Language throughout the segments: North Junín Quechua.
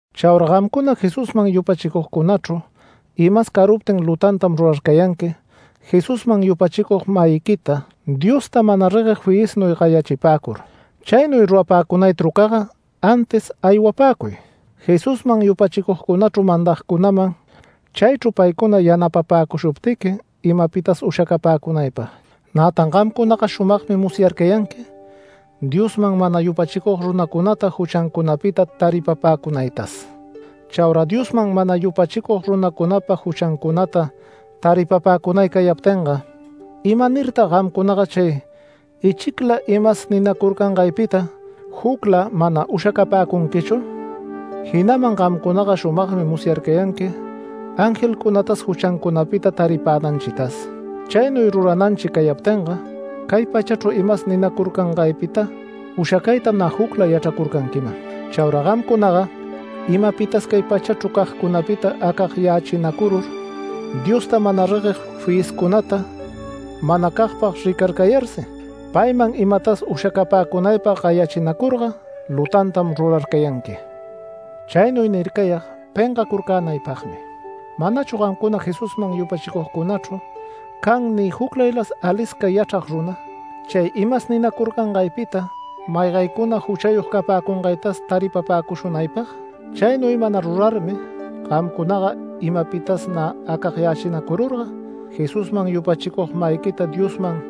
Chaura gamcuna Jesusman yupachicugcunachru imas caruptin lutantam rurarcayanqui Jesusman yupachicug-mayiquita, Diosta mana regueg fiyisman gayachipäcur. Chaynuy rurapäcunay trucaga antis aywapäcuy Jesusman yupachicugcunachru mandagcunaman chaychru paycuna yanapäcushuptiqui imapitas ushacapäcunaypag. Nätan gamcunaga shumagmi musyarcayanqui Diosman mana yupachicug runacunata juchancunapita taripapäcunaytas. Chaura Diosman mana yupachicug runacunapa juchancunata taripapäcunay cayaptinga, ¿imanirtag gamcunaga chay ichicla imas ninacurcangaypita jucla mana ushacapäcunquichu? Jinaman gamcunaga shumagmi musyarcayanqui angelcunatas juchancunapita taripänanchitas. Chaynuy rurananchi cayaptinga cay pachachru imas ninacurcangaypita ushacaytam nä jucla yachracurcanquiman. Chaura gamcunaga imapitas cay pachachru cagcunapita acagyachinacurur Diosta mana regueg fiyiscunata manacagpag ricarcayarsi, payman imatas ushacapäcunaypag gayachinacurga lutantam rurarcayanqui. Chaynuy nircayag pengacurcänaypagmi. ¿Manachu gamcuna Jesusman yupachicunachru can ni juclaylas alisca yachrag runa, chay imas ninacurcangaypita maygaycuna juchayog capäcungaytas taripapäcushunaypag? Chaynuy mana rurarmi gamcunaga imapitas nä acagyachinacururga, Jesusman yupachicug-mayiquita Diosman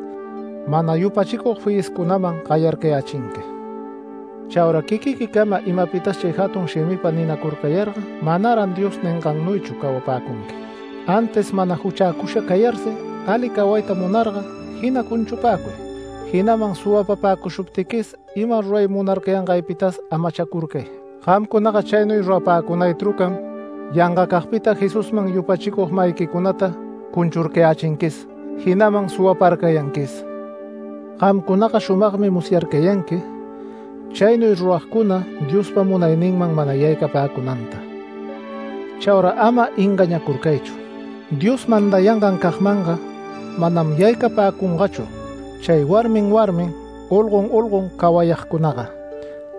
mana yupachicug fiyiscunaman gayarcayächinqui. Chaura quiquiquicama imapitas chay jatun shimipa ninacurcayarga manaran Dios ningannuychu cawapäcunqui. Antis mana juchäcusha cayarsi ali cawayta munarga jina cunchupäcuy, jinaman suwapapäcushuptiquis ima ruray munarcayangaypitas amachacurcay. Gamcunaga chaynuy rurapäcunay trucam yangacagpitam Jesusman yupachicug-mayiquicunata cunchurcayächinquis, jinaman suwaparcayanquis. Gamcunaga shumagmi musyarcayanqui chaynuy ruragcuna Diospa munayninman mana yaycapäcunanta. Chaura ama engañäcurcaychu. Dios mandayangancagmanga manam yaycapäcungachu, chay warmin warmin, olgon olgon cawayagcunaga,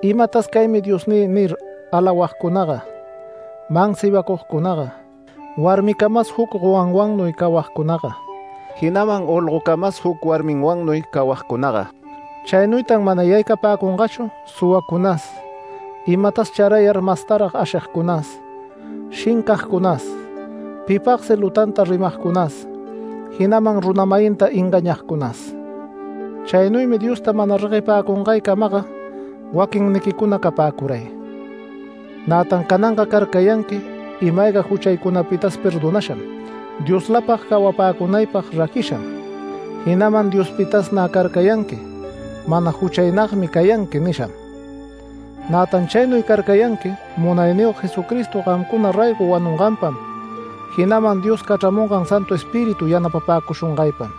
“Imatas caymi diosnï” nir alawagcunaga, mansibacugcunaga, warmicamas juc gowanwannuy cawagcunaga, jinaman olgocamas juc warminwannuy cawagcunaga. Chaynuytan mana yaycapäcungachu, suwacunas, imatas charayar mastarag ashigcunas shincagcunas pipagsi lutanta rimagcunas jinaman runa-mayinta engañagcunas. Chaynuymi Diosta mana reguepäcungaycamaga waquinniquicuna capäcuray. Nätan cananga carcayanqui ima-ayga juchaycunapitas perdonasham, Dioslapag cawapäcunaypag raquisham, jinaman Diospitas nä carcayanqui “Mana juchaynagmi cayanqui” nisham. Nätan chaynuy carcayanqui Munayniyog Jesucristo gamcuna raygo wanunganpam, jinaman Dios cachramungan Santu Espíritu yanapapäcushungaypam.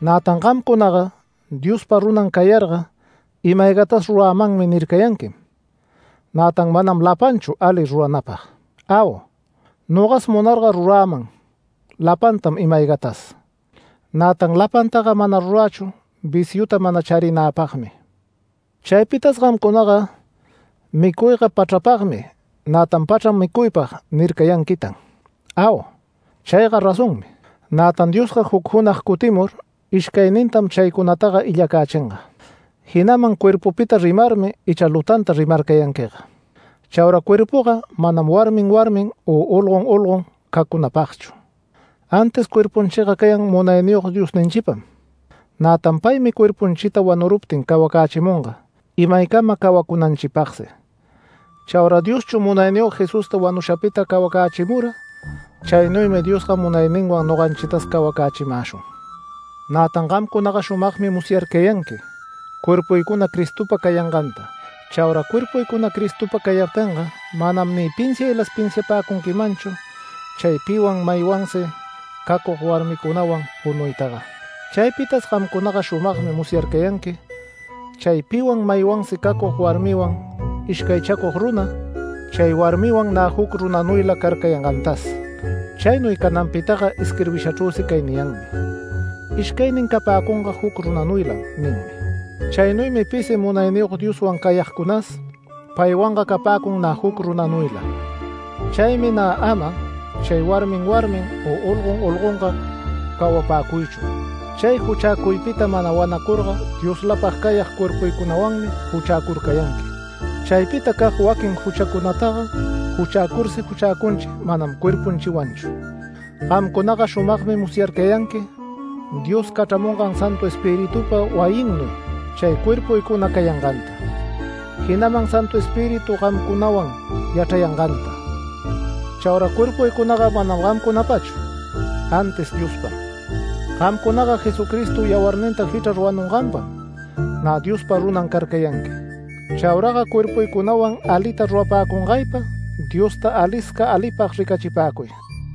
Nätan gamcunaga Diospa runan cayarga “Ima-aygatas rurämanmi” nircayanquim, nätan manam lapanchu ali ruranäpag. Au, nogas munarga ruräman lapantam ima-aygatas, nätan lapantaga mana rurächu viciuta mana charinäpagmi. Chaypitas gamcunaga “Micuyga pachrapagmi, nätan pachram micuypag” nircayanquitan. Au, chayga razonmi. Nätan Diosga juc junag cutimur ishcaynintam chaycunataga illacächinga. Jinaman cuerpupita rimarmi icha lutanta rimarcayanquiga. Chaura cuerpuga manam warmin warmin u olgon olgon cacunapagchu, antis cuerpunchiga cayan Munayniyog Diosninchipam. Nätan paymi cuerpunchita wanuruptin cawacächimunga imaycama cawacunanchipagsi. Chaura Dioschu Munayniyog Jesusta wanushapita cawacächimura. Chaynuymi Diosga munayninwan noganchitas cawacächimäshun. Nätan gamcunaga shumagmi musyarcayanqui cuerpuycuna Cristopa cayanganta. Chaura cuerpuycuna Cristopa cayaptinga manam ni pinsiaylas pinsiapäcunquimanchu chay piwan maywansi cacug warmicunawan punuytaga. Chaypitas gamcunaga shumagmi musyarcayanqui chay piwan maywansi cacug warmiwan ishcaychacug runa, chay warmiwan nä juc runanuyla carcayangantas. Chaynuy cananpitaga isquirbishachrüsi cay niyanmi: “Ishcaynin capäcunga juc runanuylam” ninmi. Chaynuymi pisi Munayniyog Dioswan cayagcunas, paywanga capäcun nä juc runanuyla. Chaymi nä ama chay warmin warmin u olgon olgonga cawapäcuychu. Chay juchäcuypita mana wanacurga Dioslapag cayag cuerpuycunawanmi juchäcurcayanqui. Chaypitacag waquin juchacunataga juchäcursi juchäcunchi manam cuerpunchiwanchu. Gamcunaga shumagmi musyarcayanqui Dios cachramungan Santu Espiritupa wayinnuy chay cuerpuycuna cayanganta, jinaman Santu Espíritu gamcunawan yachrayanganta. Chaura cuerpuycunaga manam gamcunapachu, antis Diospam. Gamcunaga Jesucristo yawarninta jichrar wanunganpam, nä Diospa runan carcayanqui. Chauraga cuerpuycunawan alita rurapäcungaypa Diosta alisca alipag ricachipäcuy.